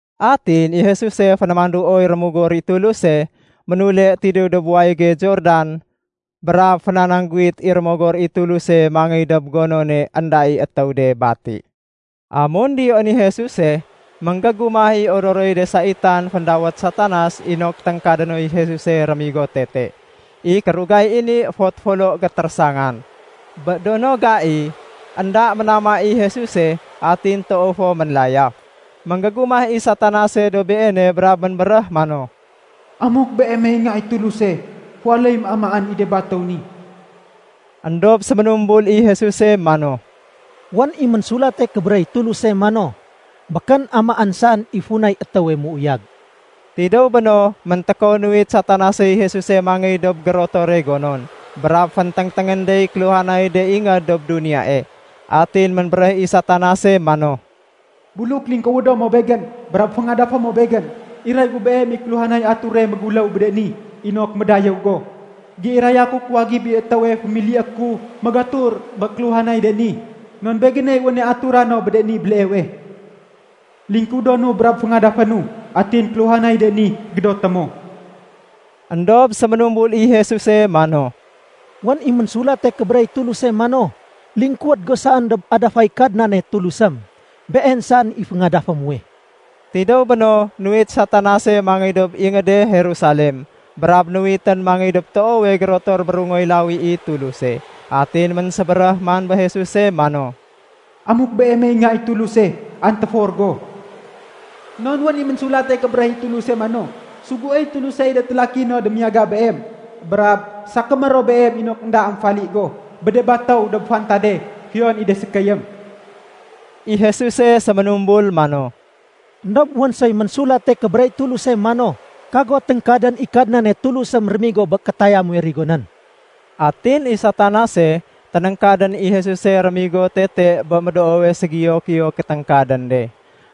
Atin i Jesuse fénémanduoy Rémogor i Tuluse, ménule tidéw dob wayége Jordan, brab fénanangguwit i Rémogor i Tuluse mangéy dob de gonon énda i étéw de bati. Amun diyoén i Jesuse, ménggégumah i odoroy de saitan féndawét Satanas inok téngkade noy Jesuse rémigo tete. I kérugay i ni éfot folo gétérésangan. Bé do no gai, énda ménama i Jesuse, atin toow fo ménlayaf. Ménggégumah i Satanase dob Beene brab ménbéréh mano, “Amuk Beemey Nga i Tuluse, féwaléyém amaén i de batéw ni.” Endob séménumbul i Jesuse mano, “Wén i Ménsulate Kébéréh i Tuluse mano, ‘Békén amaén saén i funay étéwe méuyag.’” Tidéw béno, méntékow nuwit Satanasey Jesuse mangéy dob gérotore gonon. Brab fénténgténgén dey kéluhanay de ingéd dob duniyae. Atin ménbéréh i Satanase mano, “Buluk lingkuwédo mo begén brab féngadafé mo begén, iray gu beem i kéluhanay ature méguléw bé de ni inok médayéw go. Géiraya ku kuwagib i étéwe fémilié ku magatur bé kéluhanay de ni, non begéney wéne atura no bé de ni béleewe. Lingkuwédonu brab féngadafénu, atin kéluhanay de ni gédoté mo.” Endob séménumbul i Jesuse mano, “Wén i Ménsulate Kébéréh i Tuluse mano, ‘Lingkuwéd go saén dob adafay Kadnane Tulusém. Been saén i féngadafé muwe.’” Tidéw béno, nuwit Satanase mangéy dob ingéde Jerusalem, brab nuwitén mangéy dob toowe gérotor bérungoy lawi i Tuluse. Atin ménsébéréh man bé Jesuse mano, “Amuk Beemey Nga i Tuluse, antéfor go. Non wén i Ménsulate Kébéréh i Tuluse mano, ‘Suguéy Tulusey de télaki no démiyaga Beem, brab sakémé ro Beem inok énda émfali go bé de batéw dob fantade, fiyon i de sékéyém.’” I Jesuse séménumbul mano, “Endob wén soy Ménsulate Kébéréh i Tulus mano, ‘Kago téngkadén i Kadnane Tulusém rémigo bé kétaya muwe rigonén.’” Atin i Satanas ténéngkadén i Jesuse rémigo tete bé médoowe ségiyo-giyo kéténgkadén de.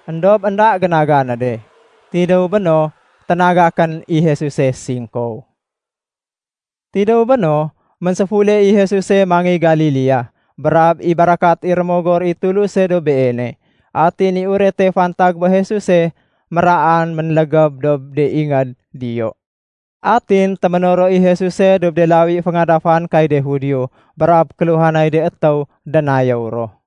Endob énda génaga né de. Tidéw béno, ténagakén i Jesuse singkow. Tidéw béno, ménséfule i Jesuse mangéy Galilea, brab i barakat i Rémogor i Tuluse dob Beene. Atin i urete fantag bé Jesuse méraan ménlégéb dob de ingéd diyo. Atin téménoro i Jesuse dob de lawi féngadafan kay de Judio brab kéluhanay de étéw dénayéw ro.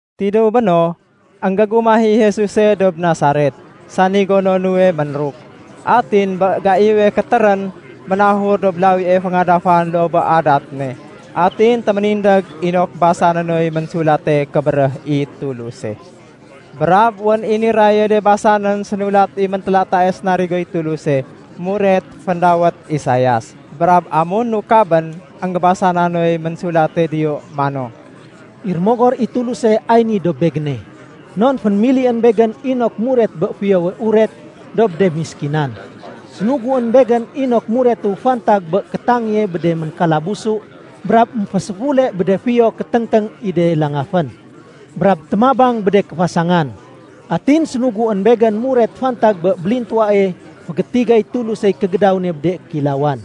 Tidéw béno, énggégumah i Jesuse dob Nasaret, sani gono nuwe ménruk. Atin bé gaiwe kétérén, ménahur dob lawie féngadafan loo bé adat ne, atin téménindég inok basané noy Ménsulate Kébéréh i Tuluse. Brab wén i niraye de basanén sénulat i Méntélatae sarigoy Tuluse muret féndawét Isaias, brab amun nukabén, énggébasa na noy ménsulate diyo mano, “I Rémogor i Tuluse ay ni dob Begéne, non fénémilién Begén inok muret bé Fiyowe Uret dob de méskinan. Sénuguén Begén inok muretu fantag bé kétangéye bé de ménkalabusu, brab émféséfule bé de fiyo kéténgténg i de langafén, brab témabang bé de kéfasangan. Atin sénuguén Begén muret fantag bé bélintuwae fégétigay Tulusey kégédaw ne bé de kéilawan.”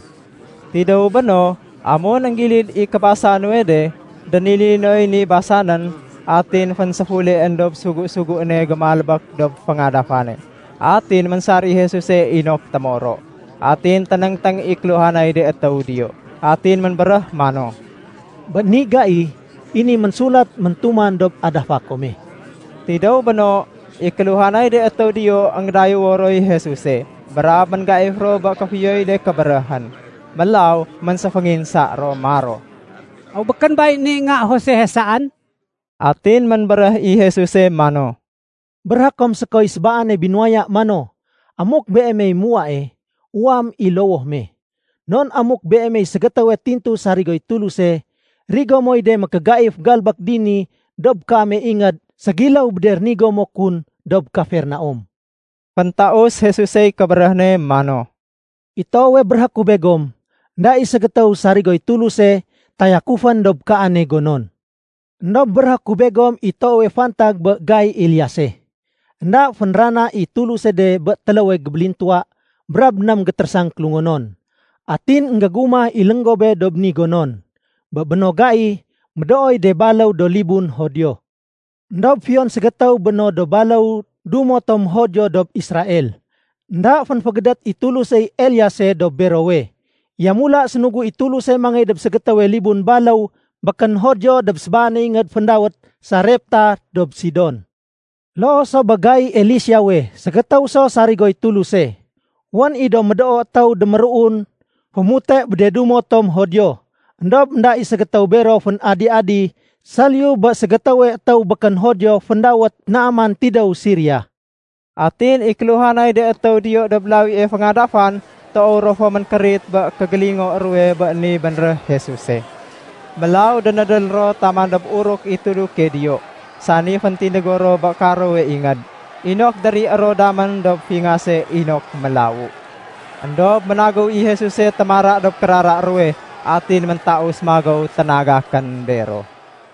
Tidéw béno, amun énggilid i kébasa nuwe de, dénili noy ni basanén, atin fénséfuleén dob sugu-suguéne gémalbék dob féngadafane. Atin ménsar i Jesuse inok témoro. Atin ténéngténg i kéluhanay de étéw diyo. Atin ménbéréh mano, “Bé ni gai, i ni ménsulat méntuman dob adafa kome.” Tidéw béno, i kéluhanay de étéw diyo énggédayéwo roy Jesuse, brab ménggaif ro bé kéfiyoy de kébéréhén. Mélaw ménséfénginsa ro maro, “Aw békén bay ni nga Josehe saén?” Atin ménbéréh i Jesuse mano, “Béréhé kom sékoy sébaane binuwaya mano, ‘Amuk beemey muwae, uwaém i lowoh me. Non amuk beemey ségétéwe tintu sarigoy Tuluse, rigo moy de mékégaif galbék dini dob kaame ingéd ségiléw bé de rénigo mo kun dob Kafernaum.’” Féntaus Jesusey kébéréh ne mano, “I toowe béréhé ku begom, énda i ségétéw sarigoy Tuluse tayakufén dob kaane gonon. Endob béréhé ku begom i toowe fantag bé gai Eliase. Enda fénrana i Tuluse de bé téléwe gébélintuwa brab éném gétérésang kélungonon. Atin énggégumah i lénggobé dob de ni gonon. Bé béno gai, médooy de baléw do libun Judio. Endob fiyon ségétéw bé no do baléw dumo tom Judio dob Israel, énda fénfégédét i Tulusey Eliase dob berowe. Yamula sénugu i Tuluse mangéy dob ségétéwe libun baléw békén Judio dob sébaane ingéd féndawét Sarepta dob Sidon. Loo so bé gai Eliseawe ségétéw so sarigoy Tuluse. Wén i do médoo étéw déméruun fémute bé de dumo tom Judio. Endob énda i ségétéw bero fén-adi-adi saliyu bé ségétéwe étéw békén Judio féndawét Naaman tidéw Siria.” Atin i de kéluhanay de étéw diyo dob lawie féngadafan toow ro fo ménkérit bé kégélingo ruwe bé ni bénréh Jesuse. Mélaw dénédél ro taman dob uruk i tuduke diyo, sani féntindégo ro bé karowe ingéd, inok dérié ro damén dob fingase inok mélawu. Endob ménagéw i Jesuse témara dob kérara ruwe atin méntaus magéw ténagakén bero.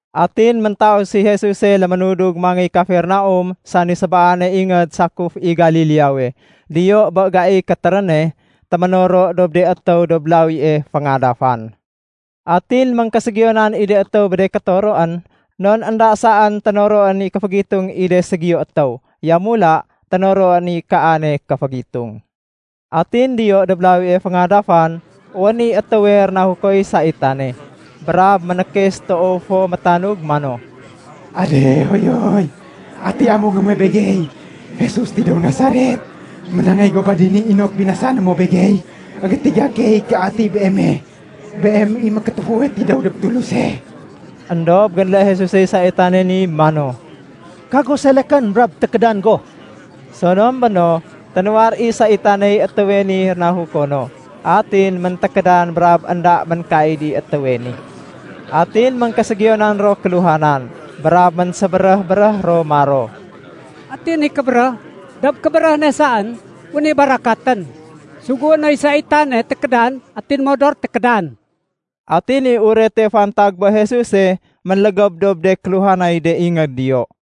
Atin méntaus i Jesuse léménudug mangéy Kafernaum sani sébaane ingéd sakuf i Galileawe. Diyo bé gaiy kétéréne, téménoro dob de étéw dob lawie féngadafan. Atin éngkéségiyonan i de étéw bé de kétoroén non énda saén ténoroén i kéfégitung i de ségiyo étéw. Yamula ténoroén i kaane kéfégitung. Atin diyo dob lawie féngadafan, wén i étéwe rénahukoy saitane. Brab ménkes toow fo métanug mano, “Adéhoyoy! Ati amungé muwe begey, Jesus tidéw Nasaret? Ménangéy go ba dini inok binasané mo begey? Enggétiga key ké ati Beeme. Beem i Mékétéfuwe tidéw dob Tuluse.” Endob génlé Jesusey saitane ni mano, “Kago selekén, brab tékédan go.” Sonom béno, ténuwar i saitaney étéwe ni rénahuko no. Atin méntékédan brab énda ménkaid i étéwe ni. Atin éngkéségiyonan ro kéluhanan. Brab ménsébéréh-béréh ro maro, “Ati ni kébéréh? Dob kébéréh ne saén wén i barakatén. Sugué noy saitane tékédan atin modor tékédan.” Atin i urete fantag bé Jesuse ménlégéb dob de kéluhanay de ingéd diyo.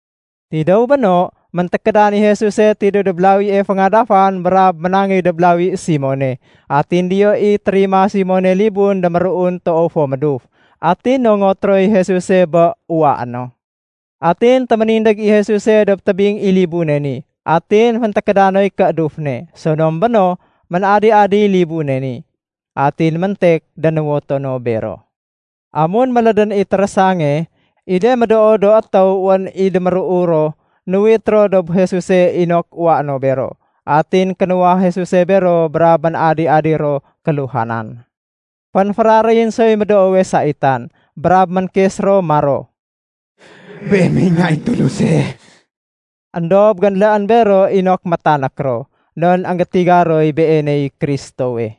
Tidéw béno, méntékédan i Jesuse tidéw dob lawie féngadafan brab ménangéy dob lawi Simone, atin diyo i térima Simone libun déméruun toow fo méduf. Atin nongot roy Jesuse bé uwaé no. Atin téménindég i Jesuse dob tébing i libune ni, atin féntékéda noy kééduf ne. Sonom béno, ménadi-adiy libune ni. Atin méntek dénuwoto no bero. Amun mélédén i térésange, i de médoo do étéw wén i déméruu ro, nuwit ro dob Jesuse inok uwaé no bero. Atin kénuwah Jesuse bero brab ménadi-adi ro kéluhanan. Fénféraréyén soy médoowe saitan. Brab ménkes ro maro, “Beemey Nga i Tuluse.” Endob génléén bero inok métanék ro, non énggétiga roy Beeney Kristowe.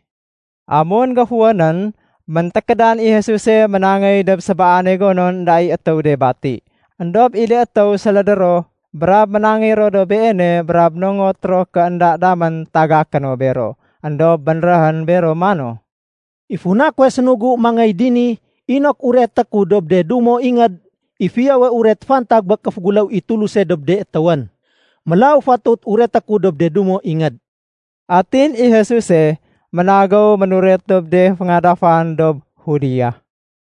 Amun géfuwénén, méntékédan i Jesuse ménangéy dob sébaane gonon énda i étéw de bati. Endob i de étéw sélédé ro brab ménangéy ro dob Beene brab nongot ro ké énda damén tagaké no bero. Endob bénréhén bero mano, “I funa kuwe sénugu mangéy dini inok ureté ku dob de dumo ingéd i Fiyowe Uret fantag bé kéféguléw i Tuluse dob de étéwén. Mélaw fatut ureté ku dob de dumo ingéd.” Atin i Jesuse ménagéw ménuret dob de féngadafan dob Judea.